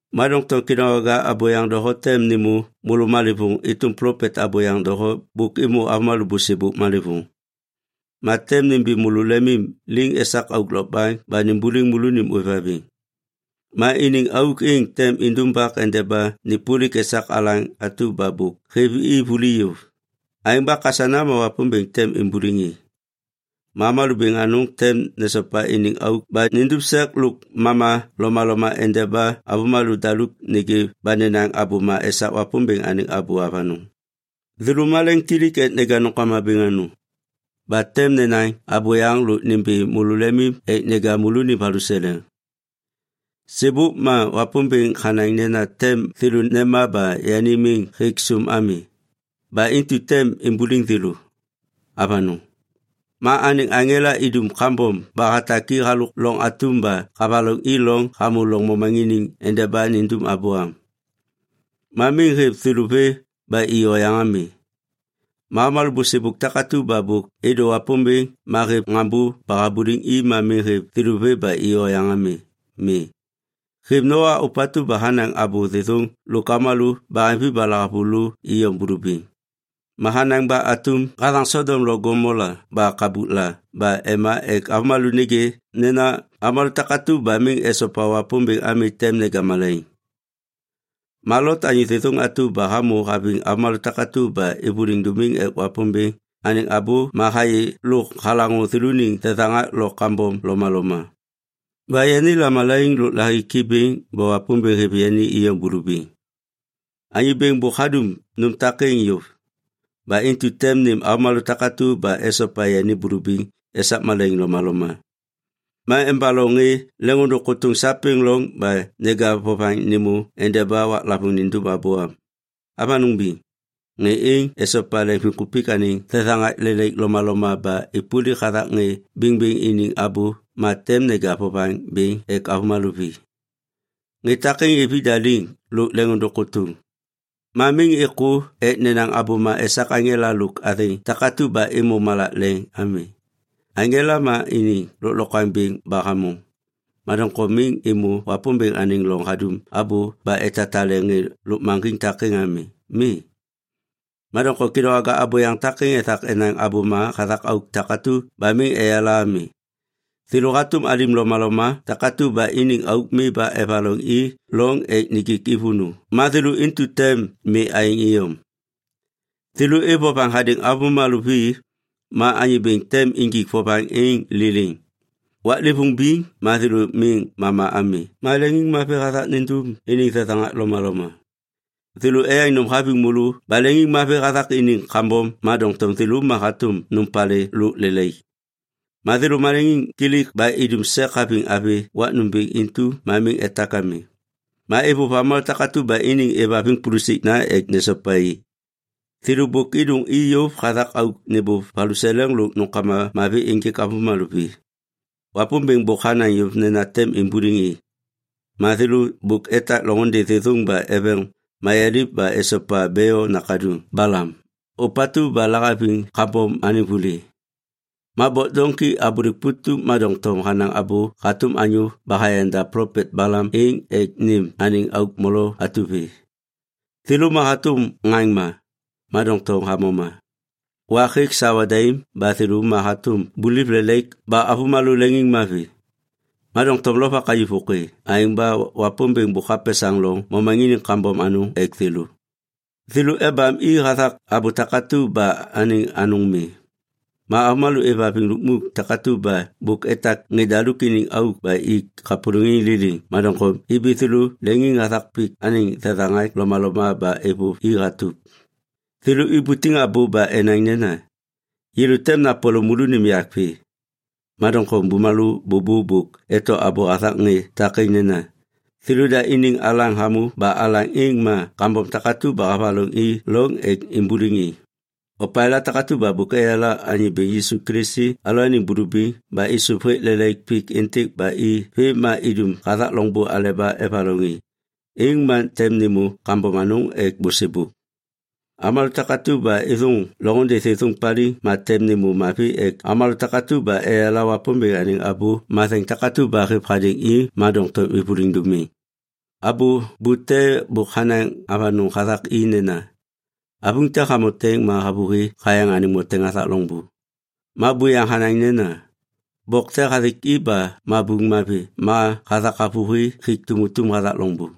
Ma doŋtom kêdôŋwaga abôyaŋ doho tem nêmô môlô malêvôŋ êtôm plopet abôyaŋ doho bôk êmô avômalô bôsêbôk malêvôŋ. Ma tem nimbi môlô lemim liŋ esak auk lokbaŋ ba nimbuliŋ môlônim ôêvhaviŋ. Ma iniŋ auk êŋ tem indumbak endeba nêpôlik esak alaŋ atu ba bôk hêv i vuli yôv. Aêŋ ba kasana ma Wapômbêŋ tem imbuliŋ i. Ma avômalô bêŋ anôŋ tem nesopa iniŋ auk ba nindum sek lôk mama lomaloma endeba avômalô daluk nêgê ba nenaŋ abôma esak Wapômbêŋ anêŋ abô avanôŋ. Thêlô maleŋkilik ek neja nômkama bêŋ anôŋ. Ba tem nenaŋ abôyaŋ lôk nimbi môlô lemim ek neja môlônim valuseleŋ. Sêbôk ma Wapômbêŋ hanaŋ nena tem thêlô nema ba yani miŋ hêk sôm ami. Ba intu tem imbuliŋ thêlô. Avanôŋ. Ma anêŋ aŋela idum kambom ba hatak i halôk loŋ atum ba havaloŋ i loŋ hamô lôv momaŋiniŋ endeba nindum abô am. Ma miŋ hêv thêlô vê ba i oyaŋ ami. Ma avômalô bôsêbôk takatu ba bôk êdô Wapômbêŋ ma hêv ŋaŋbô ba habuliŋ i ma miŋ hêv thêlô vê ba i oyaŋ ami. Mi. Hêv Noa ôpatu ba hanaŋ abô thêthôŋ lôk avômalô baheŋvi ba lahavulô iyom bulubiŋ. Ma hanaŋ ba atum hathaŋ Sodom lo Gomola ba kabukla ba ema ek avômalô nêgê nena avômalô takatu ba miŋ esopa Wapômbêŋ ami tem neja malaiŋ. Ma Lot anyô thêthôŋ atu ba hamô haviŋ avômalô takatu ba êvôliŋ dômiŋ ek Wapômbêŋ anêŋ abô ma hayê lôk halaŋô thêlôniŋ thethaŋak lo kambom lomaloma. Ba yani lamalaiŋ lôk lahiki bêŋ ba Wapômbêŋ hêv yani iyom bulubiŋ. Anyô Bêŋ bôk hadum nôm takêŋ yôv. Ba intu tem nêm avômalô takatu ba esopa yani bulubiŋ esak malaiŋ lomaloma. Ma embaloŋ ŋê leŋôndôŋ kôtôŋ sapêŋ loŋ ba neja vovaŋ êmô endeba waklavôŋ nindum abô. Avanôŋ biŋ. Ŋê êŋ esopa leŋviŋkupik anêŋ thethaŋak lelaik lomaloma ba êpôlik hathak ŋê bêŋbêŋ iniŋ abô ma tem neja vovaŋ bêŋ ek avômalô vi. Ŋê takêŋ êv ida liŋ lôk leŋôndôŋ kôtôŋ. Ma miŋ êkô ek nenaŋ abôma esak aŋela lôk athêŋ takatu ba êmô malak leŋ ami. Aŋela ma iniŋ lôklokwaŋ bêŋ ba hamôŋ. Ma doŋtom miŋ êmô Wapômbêŋ anêŋ loŋ hadum abô ba etatale ŋê lôkmaŋgiŋ takêŋ ami. Mi. Ma doŋtom kêdôŋwaga abôyaŋ takêŋ ethak enaŋ abôma hathak auk takatu ba miŋ eyala ami. Thêlô hatôm alim lomaloma takatu ba iniŋ auk mi ba evaloŋ i loŋ ek nijik i vônô ma thêlô intu tem mi aêŋ iyom. Thêlô êv vovaŋ hadêŋ avômalô vi ma Anyô Bêŋ tem injik vovaŋ êŋ liliŋ. Waklêvôŋ biŋ ma thêlô miŋ mama ami ma leŋiŋmavi hathak nindum iniŋ thethaŋak lomaloma. Thêlô eyaŋ nôm haviŋ môlô ba leŋiŋmavi hathak iniŋ kambom ma doŋtom thêlô ma hatôm nôm palê lôk lelaik. Ma thêlô maleŋiŋkilik ba idum sek haviŋ avi wak nômbêŋ intu ma miŋ etak ami. Ma êvôv avômalô takatu ba iniŋ êvhaviŋ pulusikna ek nesopa i. Thêlô bôk êdôŋ i yôv hathak auk nêbôv valuseleŋ lôk nômkama mavi ênjêk avômalô vi. Wapômbêŋ bôk hanaŋ yôv nena tem imbuliŋ i. Ma thêlô bôk etak loŋôndê thêthôŋ ba eveŋ mayaliv ba esopa Beo nakaduŋ Balam, ôpatu ba lahaviŋ kambom anêŋ vuli. Ma bok doŋki abôlêk putup ma doŋtom hanaŋ abô hatôm anyô ba hayanda plopet Balam êŋ ek nêm anêŋ auk molo atu vê. Thêlô ma hatôm ŋaŋma, ma doŋtom hamoma. Wak hêk sawa daim ba thêlô ma hatôm buliv lelaik ba avômalô leŋiŋmavi. Ma doŋtom lovak hayuv vôkê. Aêŋ ba Wapômbêŋ bôk hapesaŋ loŋ momaŋiniŋ kambom anôŋ ek thêlô. Thêlô ebam i hathak abô takatu ba anêŋ anôŋ mi. Ma avômalô êvhaviŋ lukmuk takatu ba bôk etak ŋê daluk iniŋ auk ba ik kapôlôŋiŋ liliŋ, ma doŋtom ibi thêlô leŋiŋ hathak pik anêŋ thethaŋak lomaloma ba êvôv i hatup. Thêlô ibutiŋ abô ba enaŋ nena, “Yêlô tem napole môlônim yak vê.” Ma doŋtom bumalô bôbô bôk eto abô hathak ŋê takêŋ nena, “Thêlôda iniŋ alaŋ hamô ba alaŋ êŋ ma kambom takatu ba havaloŋ i loŋ ek imbuliŋ i.” Opalêla takatu ba bôk eyala Anyô Bêŋ Yisu Kilisi alalôaniŋ bulubiŋ ba êsôv hêk lelaik pik êntêk ba i vêm ma idum hathak loŋbô aleba evaloŋ i, êŋ ma tem nêmô kambom anôŋ ek bôsêbôk. Avômalô takatu ba êthôŋ loŋôndê thêthôŋ paliŋ tem nêmô mavi ek avômalô takatu ba eyala Wapômbêŋ anêŋ abô matheŋ takatu ba hêv hadêŋ i ma doŋtom êvôliŋ dômiŋ. Abô bute bôk hanaŋ avanôŋ hathak i nena, “Avuŋ te hamoteŋ ma havôhi hayaŋ anêŋ moteŋ hathak loŋbô.” Ma buyaŋ hanaŋ nena, “Bok te hathik i ba mabuŋ mavi ma hathak havôhi hik tumutum hathak loŋbô.”